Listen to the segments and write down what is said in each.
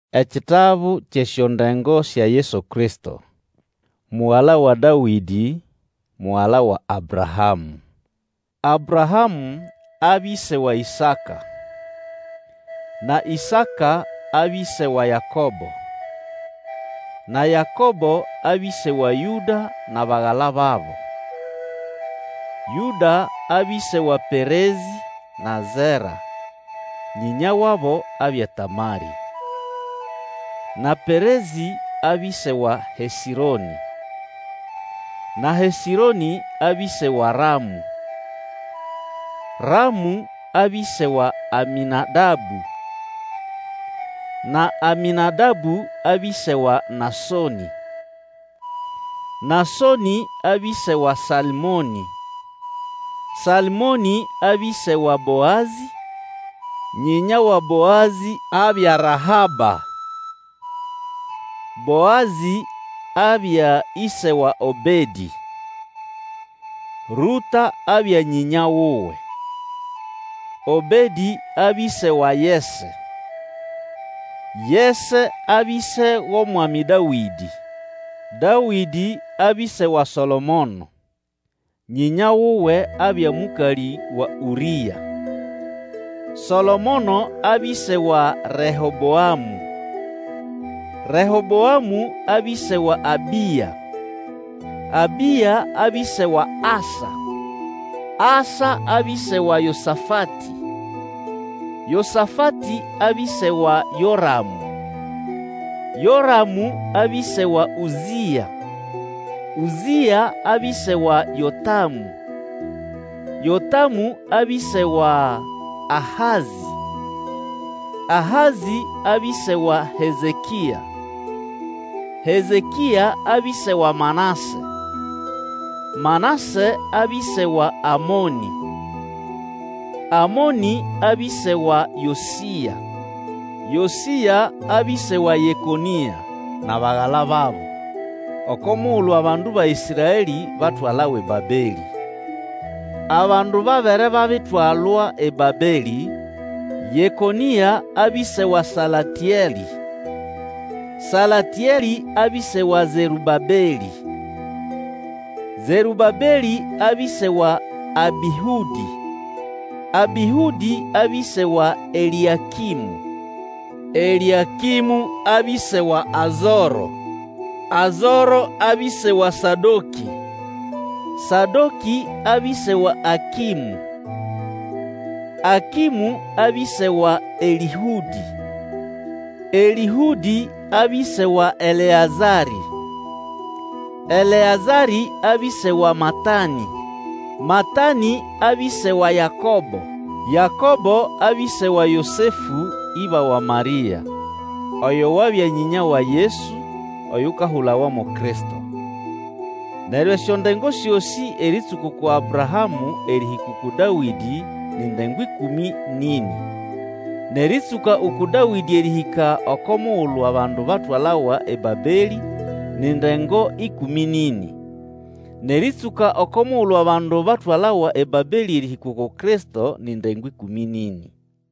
Ekitabu kyʼesyondengo sya Yesu Kristo, mugala wa Dawĩdĩ, mugala wa Abrahamũ. Abrahamũ abya ĩse wa Isaka; na Ĩsaka abya ĩse wa Yakobo; na Yakobo abya ĩse wa Yũda nʼabagala babo. Yũda abya ĩse wa Perezĩ na Zera (nyĩnya wabo abya Tamarĩ); na Perezĩ abya ĩse wa Hesĩronĩ; na Hesĩronĩ abya ĩse wa Ramũ; Ramũ abya ĩse wa Amĩnadabũ; na Amĩnadabũ abya ĩse wa Nasonĩ; Nasonĩ abya ĩse wa Salmonĩ; Salmonĩ abya ĩse wa Boazĩ (nyĩnya wa Boazĩ abya Rahaba); Boazĩ abya ĩse wa Obedĩ (Rũta abya nyĩnya wuwe); Obedĩ abya ĩse wa Yese; Yese abya ĩse wʼOmwami Dawĩdĩ. Dawĩdĩ abya ĩse wa Solomono (nyĩnya wuwe abya mũkalĩ wa Ũrĩa); Solomono abya ĩse wa Reheboamũ; Reheboamũ abya ĩse wa Abĩa; Abĩa abya ĩse wa Asa; Asa abya ĩse wa Yosafatĩ; Yosafatĩ abya ĩse wa Yoramũ; Yoramũ abya ĩse wa Ũzĩa; Ũzĩa abya ĩse wa Yotamũ; Yotamũ abya ĩse wa Ahazĩ; Ahazĩ abya ĩse wa Hezekĩa; Hezekĩa abya ĩse wa Manase; Manase abya ĩse wa Amonĩ; Amonĩ abya ĩse wa Yosĩa; Yosĩa abya ĩse wa Yekonĩa nʼabagala babo, oko mugulu abandu ba Ĩsraelĩ batwalawa eBabelĩ. Abandu babere babitwalwa eBabelĩ: Yekonĩa abya ĩse wa Salatĩelĩ; Salatĩelĩ abya ĩse wa Zerũbabelĩ; Zerũbabelĩ abya ĩse wa Abĩhũdĩ; Abĩhũdĩ abya ĩse wa Elĩakĩmũ; Elĩakĩmũ abya ĩse wa Azoro; Azoro abya ĩse wa Sadokĩ; Sadokĩ abya ĩse wa Akĩmũ; Akĩmũ abya ĩse wa Elĩhũdĩ; Elĩhũdĩ abya ĩse wa Eleazarĩ; Eleazarĩ abya ĩse wa Matanĩ; Matanĩ abya ĩse wa Yakobo; Yakobo abya ĩse wa Yosefũ, ĩba wa Marĩa, oyo wabya nyĩnya wa Yesu, oyukahulawa mo Kristo. Neryo esyondengo syosĩ erĩtsũka uku Abrahamũ erĩhĩka uku Dawĩdĩ ni ndengo ĩkũmĩ nʼĩnĩ; nʼerĩtsũka uku Dawĩdĩ erĩhĩka oko mugulu abandu batwalawa eBabelĩ ni ndengo ĩkũmĩ nʼĩnĩ; nʼerĩtsũka oko mugulu abandu batwalawa eBabelĩ erĩhĩka uku Kristo ni ndengo ĩkũmĩ nʼĩnĩ.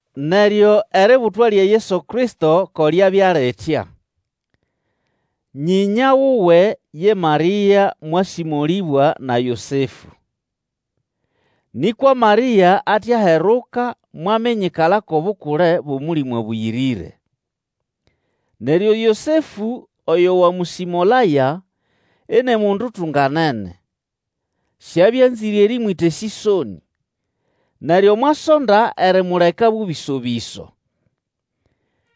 Neryo eributwa lya Yesu Kristo ko lyabya litya. Nyĩnya wuwe ye Marĩa mwasĩmolĩbwa na Yosefũ. Nĩkwa Marĩa ate aheruka mwaminyikala kʼobukule bwʼOmũlĩmũ Abũyĩrĩre. Neryo Yosefũ oyo wamũsĩmolaya, ini mundu utunganene, siabya anzĩre erĩmwĩta esĩsonĩ, neryo mwasonda erimuleka bũbĩso-bĩso.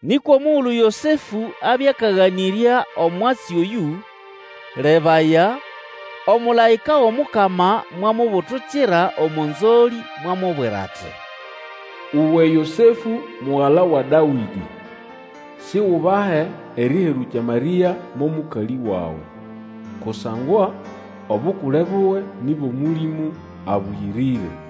Nĩkwa omugulu Yosefũ abya akaganĩrya omwatsi oyũ, lebaya, omũlaĩka wʼomukama mwamubutukira omo nzolĩ mwamubwira ati, Uwe Yosefũ, mugala wa Dawĩdĩ, Sigubahe erĩherũkya Marĩa mo mũkalĩ wawe, kusangwa obukule buwe ni bwʼOmũlĩmũ Abũyĩrĩre.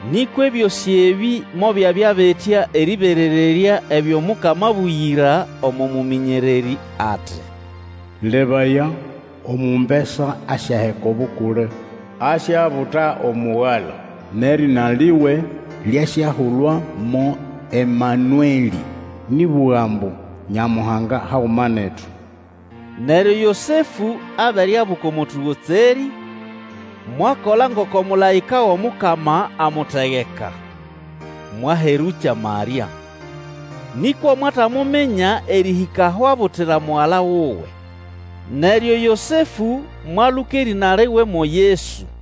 Nĩkwa ebyosĩ ebĩ mobyabya bitya erĩberererya ebyo Mukama abũgĩra omo mũmĩnyererĩ ati, Lebaya, omumbesa asyaheka obukule, asyabuta omugala, nʼerĩna liwe lyasyahulwa mo Emanuelĩ, nĩʼbũga ambu: Nyamuhanga haguma netu. Neryo Yosefũ abere abuka omo tũgotserĩ, mwakola ngoko mũlaĩka wʼomukama amutegeka, mwaherũkya Marĩa. Nĩkwa mwatamuminya erĩhĩka aho abutira mugala wuwe. Neryo Yosefũ mwaluka erĩna liwe mo Yesu.